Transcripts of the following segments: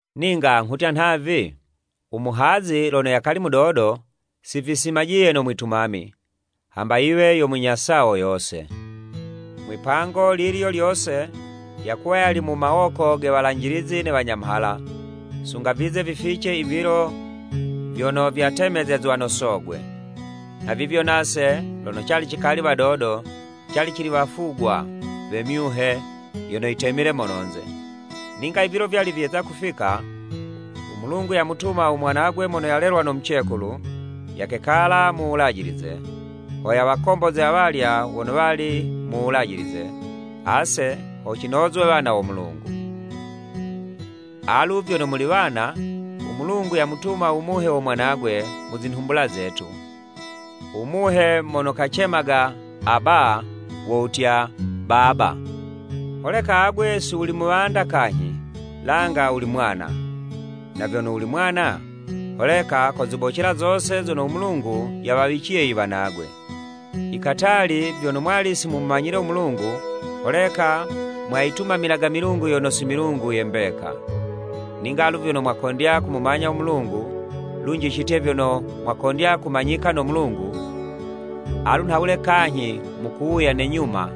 Ninga nghutya nhavi, u muhazi lono yakali mudodo, si visimajiye no mwitumami, hamba yiwe yo munya sawo yose. Mwipango lilyo lyose yakuwa yali mu mawoko ge walanjilizi ne wanyamhala, sunga vize vifice i vilo vyono vyatemezezwa no sogwe. Nhavivyo nase lono cali cikali wadodo, cali cili wafugwa we myuhe yono yitemile mononze. Ninga i vilo vyali vyeza kufika, u Mulungu yamutuma u Mwanagwe mono yalelwa no mucekulu, yakekala mu Wulajilize, ho yawakomboze awalya wono wali mu Wulajilize, ase ho cinozwe wana wo Mulungu. Alu vyono muli wana, u Mulungu yamutuma u Muhe wo Mwanagwe mu zinhumbula zetu, u Muhe mono kacemaga, “Aba,” wo wutya “Baba.” Holeka alu agwe si wuli muwanda kanyhi, langa wuli mwana. Na vyono wuli mwana, holeka kozibocela zose zono u Mulungu yawawiciye i wanagwe. I katali vyono mwali si mumumanyile u Mulungu, holeka mwayitumamilaga milungu yono si milungu ye mbeka. Ninga alu vyono mwakondya kumumanya u Mulungu, lunji citye vyono mwakondya kumanyika no Mulungu, alu nhawule kanyhi mukuwuya ne nyuma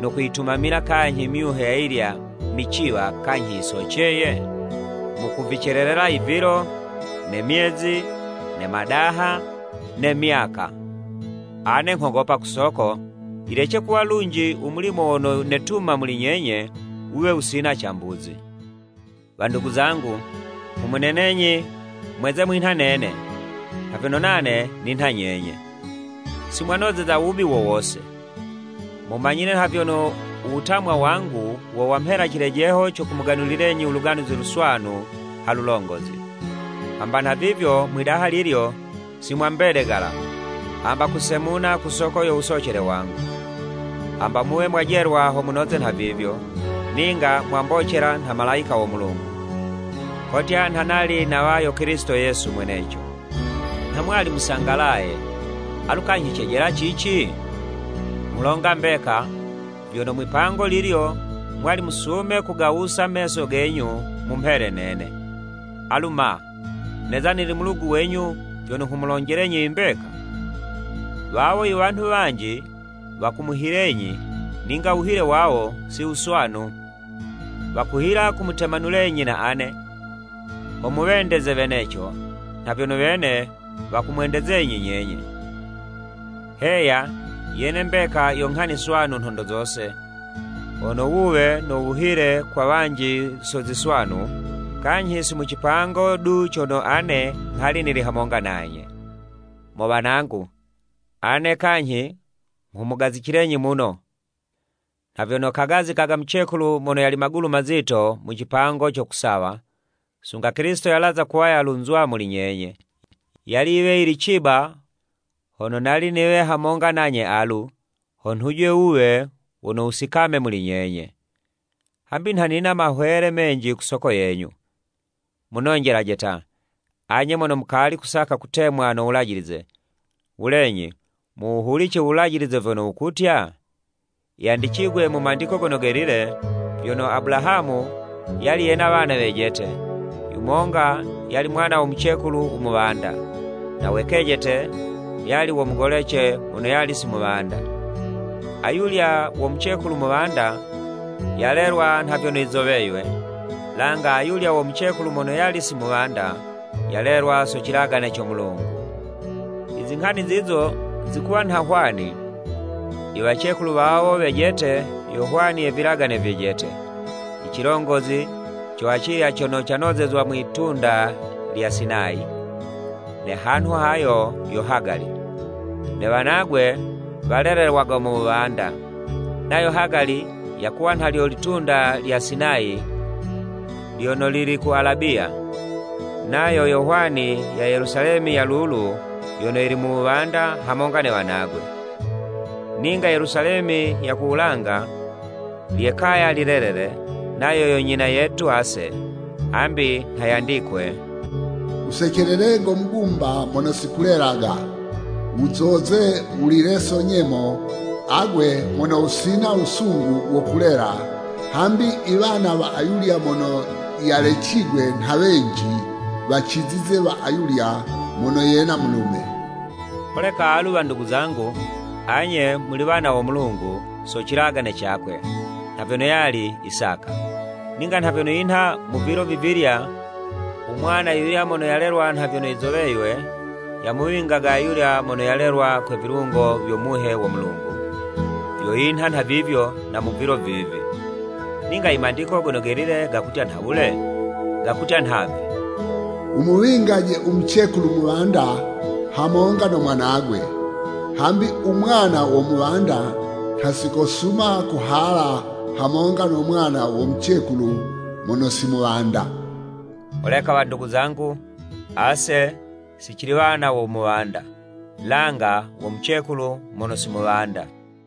no kuyitumamila kanyhi myuhe ayilya miciwa kanyhi yisoceye? Mukuvicelelela i vilo, ne myezi, ne madaha, ne myaka! Ane nghogopa ku soko, yilece kuwa lunji u mulimo wono netuma muli nyenye, wuwe wusina cambuzi. Wandugu zangu, nghumunenenyi mweze mwinha nene, nha vyono nane ninha nyenye. Si mwanozeza wubi wo wose. Mumanyile nha vyono u wutamwa wangu wo wamhela cilejeho co kumuganulilenyi u Luganuzi Luswanu ha lulongozi. Hamba nhavivyo mwidaha lilyo si mwambedegala hamba kusemuna ku soko yo wusocele wangu, hamba muwe mwajelwa ho munoze nhavivyo, ninga mwambocela nha malayika wo Mulungu, kotya nha nali nawa yo Kilisito Yesu mweneco. Nha mwali musangalaye, alu kanyhi cejela cici? Nghulonga mbeka, vyono mwipango lilyo mwali musume kugawusa meso genyu mumhele nene. Alu ma! Neza nili mulugu wenyu vyono nghumulonjelenyi i mbeka? Wawo i wanhu wanji wakumuhilenyi, ninga wuhile wawo si wuswanu. Wakuhila kumutemanulenyi na ane, ho muwendeze weneco, nha vyono wene wakumwendezenyi nyenye. Heya, yene mbeka yo nghani swanu nhondo zose, hono wuwe no wuhile kwa wanji so ziswanu, kanyhi si mu cipango du cono ane nghali nili hamonga nanye. Mo wanangu, ane kanyhi nghumugazicilenyi muno nha vyono kagazikaga mucekulu mono yali magulu mazito mu cipango co kusawa, sunga Kilisito yalaza kuwa yalunzwa muli nyenye. Yali yiwe yili ciba hono nali niwe hamonga nanye alu, ho nhuje wuwe wono wusikame muli nyenye. Hambi nha nina mahwele menji ku soko yenyu. Munonjelaje ta, anye mono mukali kusaka kutemwa no Wulajilize, Wulenyi muwuhulice u Wulajilize vyono wukutya? Yandicigwe mu Mandiko Gono Gelile, vyono Abulahamu yali yena wana wejete, yumonga yali mwana wo mucekulu u muwanda, na we kejete yali wo mucekulu mono yali si muwanda. Ayulya wo mucekulu muwanda yalelwa nha vyono yizoweywe, langa ayulya wo mucekulu mono yali si muwanda, yalelwa so cilagane co Mulungu. I zinghani zizo zikuwa nha hwani, i wacekulu wawo wejete yo hwani ye vilagane vyejete, i cilongozi co acilya cono canozezwa mwitunda lya Sinayi, ne hanhu hayo yo Hagali, ne wanagwe walelelwaga mu wuwanda. Nayo Hagali yakuwa nha lyo litunda lya Sinayi lyono lili ku Alabiya, nayo yo hwani ya Yelusalemi ya lulu yono yili mu wuwanda hamonga ne wanagwe. Ninga Yelusalemi ya ku wulanga, lye'kaya lilelele, nayo yo nyina yetu ase. Hambi nha yandikwe: “Wusecelele go mugumba mono si kulelaga wuzoze, wulile so nyemo agwe mono wusina wusungu wo kulela hambi i wana wa ayulya mono yalecigwe nha wenji, wacizize wa ayulya mono yena mulume.” Holeka alu wandugu zangu, anye muli wana wo Mulungu, so cilagane cakwe, nha vyono yali Isaka. Ninga nha vyono yinha mu vilo vivilya u mwana yuyulya mono yalelwa nha vyono yizoweywe, yamuwingaga ayulya mono yalelwa kwe vilungo vyo Muhe wo Mulungu, vyo yinha nhavivyo na mu vilo vivi. Ninga I Mandiko Gono Gelile gakutya nhawule? Gakutya nhavi, “Wumuwingaje u mucekulu muwanda hamonga no mwanagwe, hambi u mwana wo muwanda nha si kosuma kuhala hamonga no mwana wo mucekulu mono si muwanda.” Holeka wandugu zangu, ase si cili wana wo muwanda, langa wo mucekulu mono si muwanda.